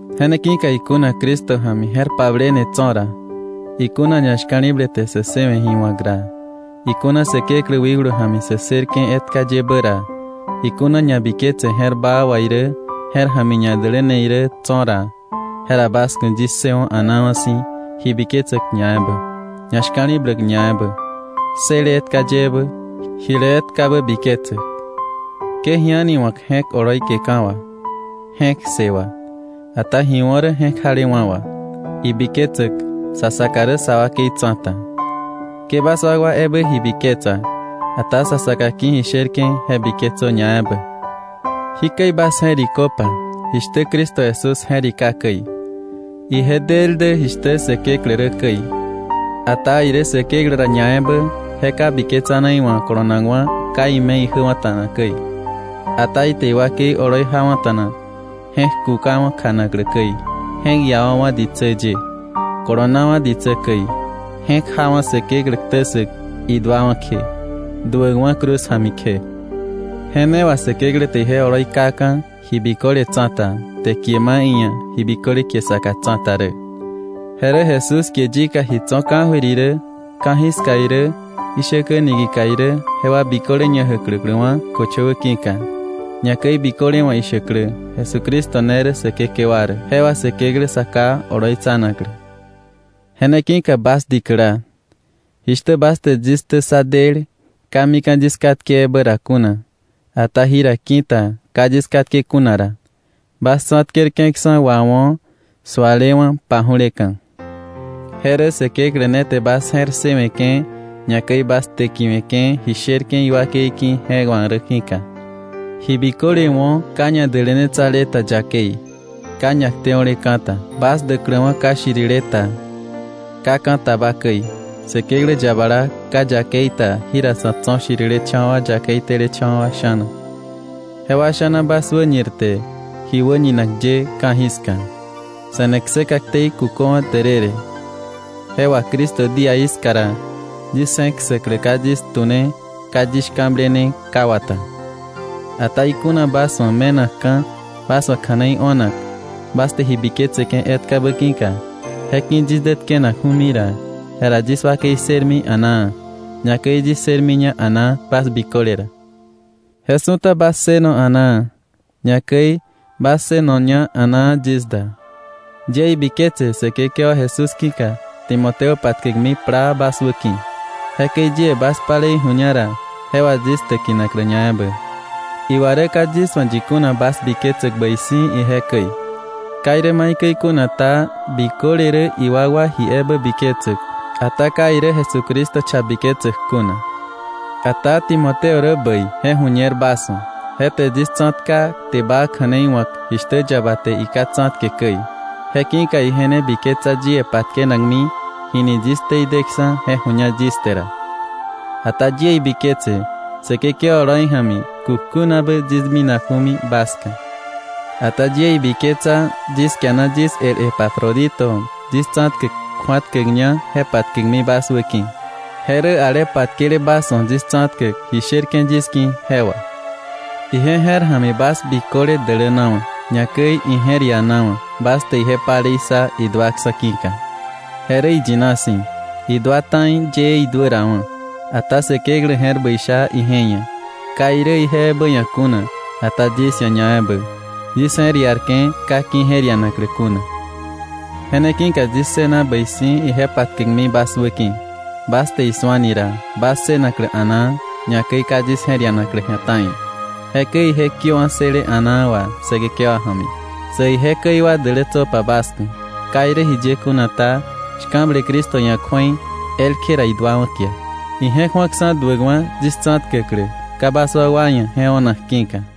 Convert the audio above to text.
Je ne ki̱ka ikuna Cristo ja̱mi je̱r pablene tso̱ ra, ikuna ñashka̱li̱ble te sä ssëwe̱ ji wa̱k ra, ikuna Säkeklä wikblu ja̱mi sä ssërke̱ etka yebä ra, ikuna ñabiketse je̱r baa wà irä je̱r ja̱mi ñadäläne irä tso̱ ra, jera bas ku̱ yis ssëwo̱ a̱naawa̱ si̱ ji biketsäk ñaebä, ñashka̱li̱bläk ñaebä, ssële etka yebä, jile etkabä biketsäk. Ke ji a̱ni wa̱k je̱k oloi keka̱ wà, je̱k ssë wà, ata ji wo̱ rä je̱k jalewa̱ wà, ibiketsäk sa saka rä sa wakei tsa̱ta. Ke bas wakwa ebä ji biketsa, ata sa saka ki̱ ji sherke̱ je biketsö ñaebä. Jikäi bas je̱riköpa jishtä Cristo Jesús je̱rika käi: Ije del dä jishtä Säkeklä rä käi, ata irä Säkeklä ra ñaebä je ka biketsane iwa̱ kolonakwa̱ ka ime̱ ijäwa̱ta̱na käi. Ata ite iwakei oloi jawa̱ta̱na, je̱k kukawa̱ kjanaklä käi, je̱k iawa̱wa̱ ditsä ye, kolonawa̱ ditsä käi, je̱k jawa̱ Säkeklä ktä ssäk iduawa̱ kje, duäkwa̱ cruz ja̱mi kje. Je ne wà Säkeklä te ije oloi kaka̱ ji biköle tsa̱ta, te kie ma iia̱ ji biköle kie saka tsa̱ta rä, je rä Jesús kie yika ji tso̱ ka̱jöir irä ka̱jiska irä ishäkä niki̱ka irä jewa biköle ñajäkläkläwa̱ köchöwä ki̱ka, ñakäi biköle wa̱ ishäklä Jesucristo ne rä Säkekewa rä, je wà Säkeklä Sa Ká oloitsanaklä. Je ne ki̱ka bas dikäla, jishtä bas te yis ktä ssa del ka mika̱ yis katke ebä ra kuna, ata jira ki̱ta ka yis katke kuna ra, bas tsa̱tkerke̱ksa̱ wawo̱ sualewa̱ paju̱leka̱. Je rä Säkeklä ne te bas je̱r ssëwe̱ke̱ ñakäi bas täkiwe̱ke̱ ji sherke̱ iwakei ki̱ je wa̱k rä ki̱ka. Ji biköle wo̱ ka ñadälänetsale ta yakei, ka ñakteo̱leka̱ ta, bas däkläwa̱ ka shirile ta, ka ka̱ taba käi, Säkeklä yabala, ka yakei ta jira sa̱ tso̱ shirilecha̱wa̱ yakei telecha̱wa̱ sha̱na. Jewa sha̱na bas wäñirte ji wäñinak ye ka̱jiska. Se̱ne kseka ktei kuköwa̱ därërë, je wà Cristo díaí ska ra yis je̱k ssäklä ka yis tu̱ne, ka yis shka̱blene ka wata. Ata ikuna bas wa̱ me̱nakka̱ bas wa̱ kja̱nei o̱nak bas te ji biketseke̱ etkabä ki̱ka, je ki̱ yis dä tkenakju̱mi ra, jera yis wakei ssërmi a̱naa, ñakäi yis ssërmiña a̱naa bas biköle ra. Je su̱ta bas ssëno a̱naa, ñakäi bas ssënoña a̱naa yis da. Yie ibiketse Säkekewa Jesús ki̱ka Timoteo patkäkmi plaa bas wäki̱, jekäi yie bas palei ju̱ña ra je wà yis täkinaklä ñaebä. Iwa rä ka yis wa̱ yi kuna bas biketsäk bäi si̱ ije käi. Ka irä maikäi kuna ta, biköle rä iwakwa ji ebä biketsäk, ata ka irä Jesucristo cha biketsäk kuna. Ata Timoteo rä bäi je ju̱ñer bas wa̱. Je te yis tsa̱tka kte baa kja̱nei wa̱k jishtä yaba te iká tsa̱tke käi. Je ki̱ka ije ne biketsa yie patkenakmi, jini yis ktei deksa̱ je ju̱ña yis te ra. Ata yie ibiketse Säkekewa oloi ja̱mi kukjunabä yis minaju̱mi bas ska. Ata yie ibiketsa yis kiana yis el Epafrodito yis tsa̱tkäk kju̱atkäkña, je patkäkmi bas wä ki̱. Je rä ale patkele bas wa̱ yis tsa̱tkäk ji sherke̱ yis ki̱ jewa. Ije je̱r ja̱mi bas biköle dälänawa̱, ñakäi ije̱r ianawa̱ bas te ije palei ssa iduaksa̱ ki̱ka. Je rä iyina si̱, idua ta̱i yëë iduärawa̱. Ata Säkeklä je̱r bäi sha ije ia̱; ka irä ije ebä ia̱ kuna, ata yis ia̱ ñaebä, yis je̱r iarke̱ ka ki̱je̱r ianaklä kuna. Je ne ki̱ka yis ssëna bäi si̱ ije patkäkmi bas wäki̱, bas te isu̱ani ra, bas ssënaklä a̱naa, ñakäi ka yis je̱r ianaklä ji̱a ta̱i. Jekäi ije kiöwa̱ ssële a̱naa wà Säkekewa ja̱mi. Sä ije käi wa dälätsöpa bas ku̱. Ka irä jiye kuna ta, shka̱ble Cristo ia̱ kju̱ei, elkje ra iduawa̱ kia. Ije̱k ju̱akksa̱ duäkwa̱ yis tsa̱tkäklä, ka bas wakwa ia̱ je o̱nak ki̱ka.